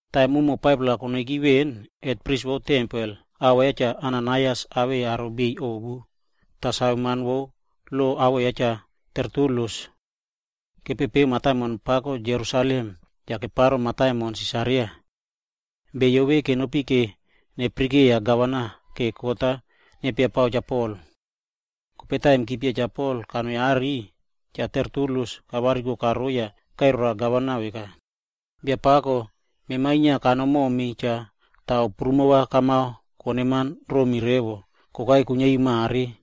Taim umo 5-pla konoiki veꞌen, hetpris vo tempel awoꞌo ya Cha Ananaias tah yei aro biꞌiy ovu, yah saveman vo lo awoꞌo ya Cha Tertulus. Kepepeu mataimon pako Jerusalem yah keparo mataimon Sisaria. Beyo vemona kenopi va neyaraka gavana vora kot-a nepiapao Cha Pol. Kope taim chipia Cha Pol kanoi are, Cha Tertulus kavariko karoi yah kairai roa Gavman-a veka, “Biabiꞌiy, mema inia kanomi momi cha tah ao prumo kamao koneman romi revo kokai kuiniari mare.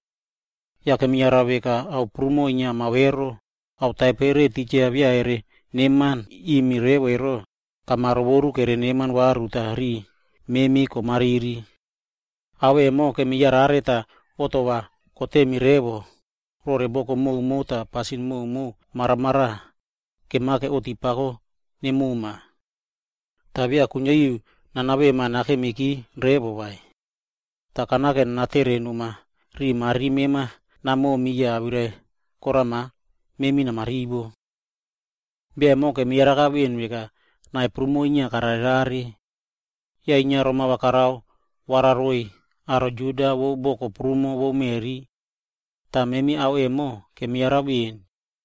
Yah kemiyara veka ao koka inia kamao ero, ao taipere titja beya kereneman rimi revo ero, kamarovoru kereneman varu tah riꞌi memi komariri. Ao emo kemiyarare tah ova koromi poaka, rore boko koka yah pasin koka maramaraꞌa, kemake oꞌti pako nemoma. Toh beya kuiniari nanavema nakemiki revo vai. Toh kanao nanatere noma riꞌi mariri mema namomi yah awirai korama memi namarivo. “Bia emo kemiyaraka veꞌen veka nai prumo inia kararerare. Yah inia roma karao vararoiy aro Juda vo boko koka vo meꞌri. Yah memi ao vemona kemiyara veꞌen.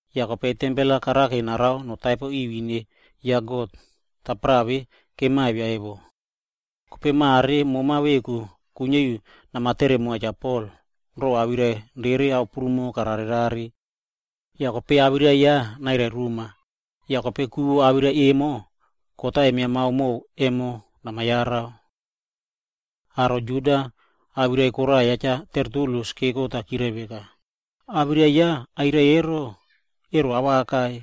Yah kope karake narao tempel-a notaipo ri ine ya God, tapara vemo kemavia emo.b Yah mare mema veku kuiniari namatere moa Cha Pol ro awirai rere ao koka kararerare. Yah kope awirai yah nairai roma, kope va ku vo awirai vemona kot-a kemiamao mo emo va namayara.” Aro Juda awirai koraꞌa ya Cha Tertulus keko tah chirai veka, “Awirai ya kairai ro ero, ero awaka.”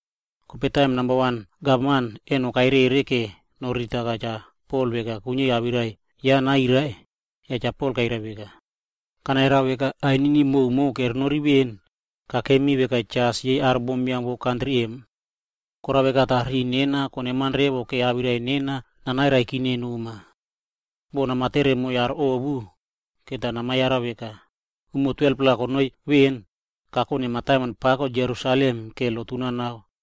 Kope taim namba wan Gavman eno-a karoro vora noriritaka Cha Pol veka kuiniari awirai ya nairai, yah Cha Pol kairai veka, “Kanayara veka ainini prumo kerenoriki veꞌen, mema kakemi veka jas yei aro bombiam vo kantri vemona. Korao veka tah riꞌi nena konenam revo va awirai nena nanairai noma. Boh namatere moiy aro ovu, va namayara veka, umo 12-pla konoiki veꞌen, kakone mataimon pako Jerusalem va lotu nanao.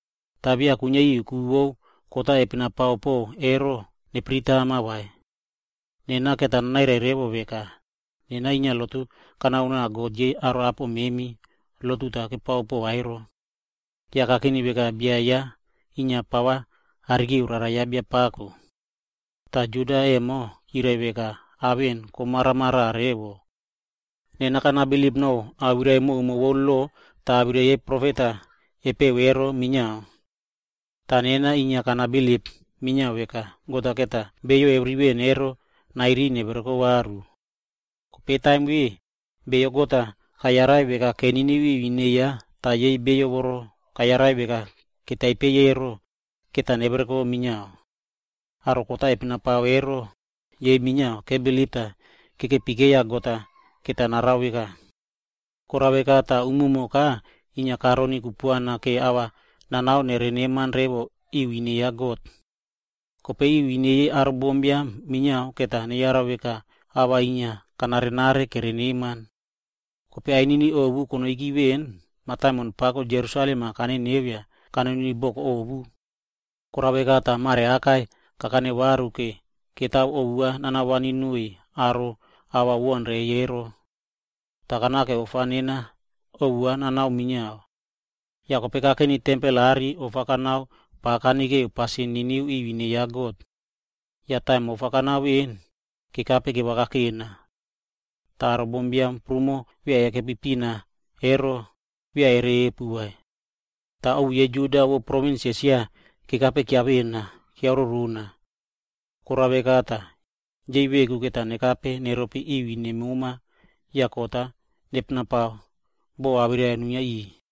Yah beya kuiniari ku vo awirai kot-a kepena pao po ero, nepiritama vai. Toh nena va nanairai revo veka nena bia emo inia lotu kanao nova God, aro apo memi lotu inia kepao pova. Yah kakeni veka bia ya pava kanekeu Rara ya Biapako.c Yah aro Juda emo chirai veka ao vemona komara revo. Nena kanabilip nore awirai koka vo lo yah awirai yei profet-a kepeꞌe ero minia. Yah nena inia kanabilip minia veka God-a va nairiy beyo keviri veꞌen ero va neverekope varu. Yah kope taim vemona beyo God-a kayarai veka keniniu piya ine ya ero tah yei beyo voro kayarai veka ketaipo ero, va nevereko minia. Aro voro kot-a kepina pao ero minia kebilip tah kekepi keiya God va narao veka emo. Korao veka tah umumoka inia karoni kupuana vora ava nanao noneman ri ine ya God. Yah kope ri ine yei aro bombiam minia va neyara veka nena ava ina kanarenare kereneman. “Kope ainini ovu konoiki veꞌen mataimon pako Jerusalem emo kaneneu yah kanoni boko ovu. Korao veka tah mare aka kakane varu va mani pina naniꞌiy aro ava kerebaun reiy. Yah kanao ofa nena pina nanao minia. Kope kakeni ofa nena kanao tempel are, yah pa kanekeu pasin vo nana niniu ri ine ya God. Yah taim ofa kanao kobaunki, kekape kevakakena. Yah aro bombiam prumo beya kekepi pina vai, tah beya ririvakeko vai. Toh ovu yei Juda vo provins Esia emo, kekape kiavena. Korao veka tah, yei veku va nekape neropi ine mema yah kot-a nepenapao boh awirai-a nuinia riꞌiy.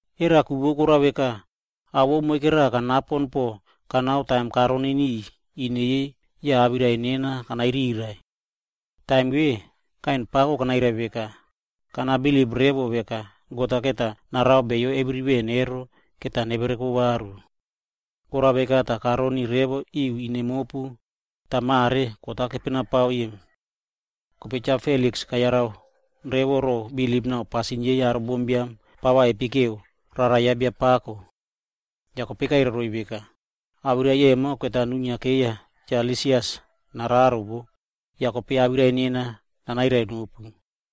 Era ku vo korao veka, ao vo moikera kanapo kanao taim karoni ine yei tah awirai nena kanairiraiꞌvo. Taim vemona, kaiꞌen pako tah kanairai veka, ‘Nena kanabilip revo veka God-a va narao beyo keviri veꞌen ero va nevereko varu. Korao veka tah mare karoni ine mopu tah kot-a kepenapao.’” Kope Cha Feliks kasave revo ro bilip na pasin yei aro bombiam pa kepekeu Rara ya Biapako. Yah kope kairai roiy veka, “Kope awirai vemona va nuinia wo, Cha Lisias nararo yah kope awirai nena nanairai nopu.”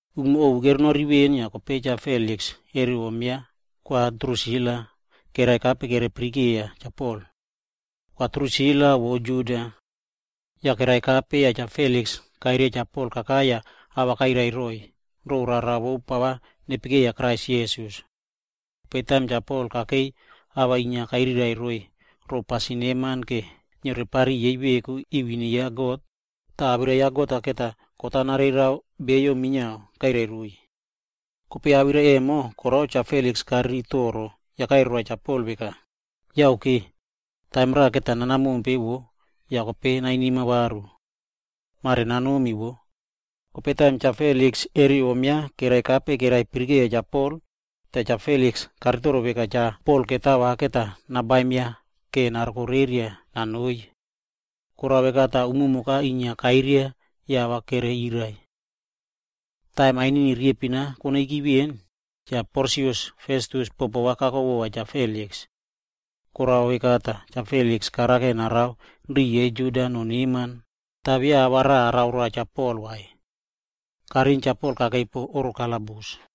Umo ovu kerenoriki veꞌen yah kope Cha Feliks re om ya Kwa Drusila kerekape kereyaraka Cha Pol. Kwa Drusila emo vo Juda bom. Yah kerekape tah Cha Feliks kairia Cha Pol kakai yah ava kairai roiy ro rara vo pa nepekeiya Krais Jisas. Kope taim Cha Pol kakei awirai-a inia kairai roiy ro pasin neman yah niore pariꞌiy yei veku ri ine ya God, yah awirai vo God-a va kot-a nareirao beyo minia kairai roiy. Yah awirai vemona korao Cha Feliks kariri poaka yah kairai roa Cha Pol veka, “Yake. Taim-a raꞌa nana mompe vo yah kope va nainima nakame vova. Mare nanomi vo.” Kope taim Cha Feliks re om ya inia kerekape tah kereyaraka Cha Pol, Cha Feliks emo inia karitoro veka Cha Pol va mani nabaim ya vora narokoreria nanoi. Korao veka tah umumoka inia kairia tah ava inia keyiriraiꞌvo. Kope taim ainini riyempin konoiki veꞌen Cha Porsius Festus bopo ya Cha Feliks kako. Korao veka tah Cha Feliks karao va narao riꞌi yei Juda noneman tah beya ao rava karao roa Cha Pol vai. Kariꞌin Cha Pol kakei pon oꞌro kalabus.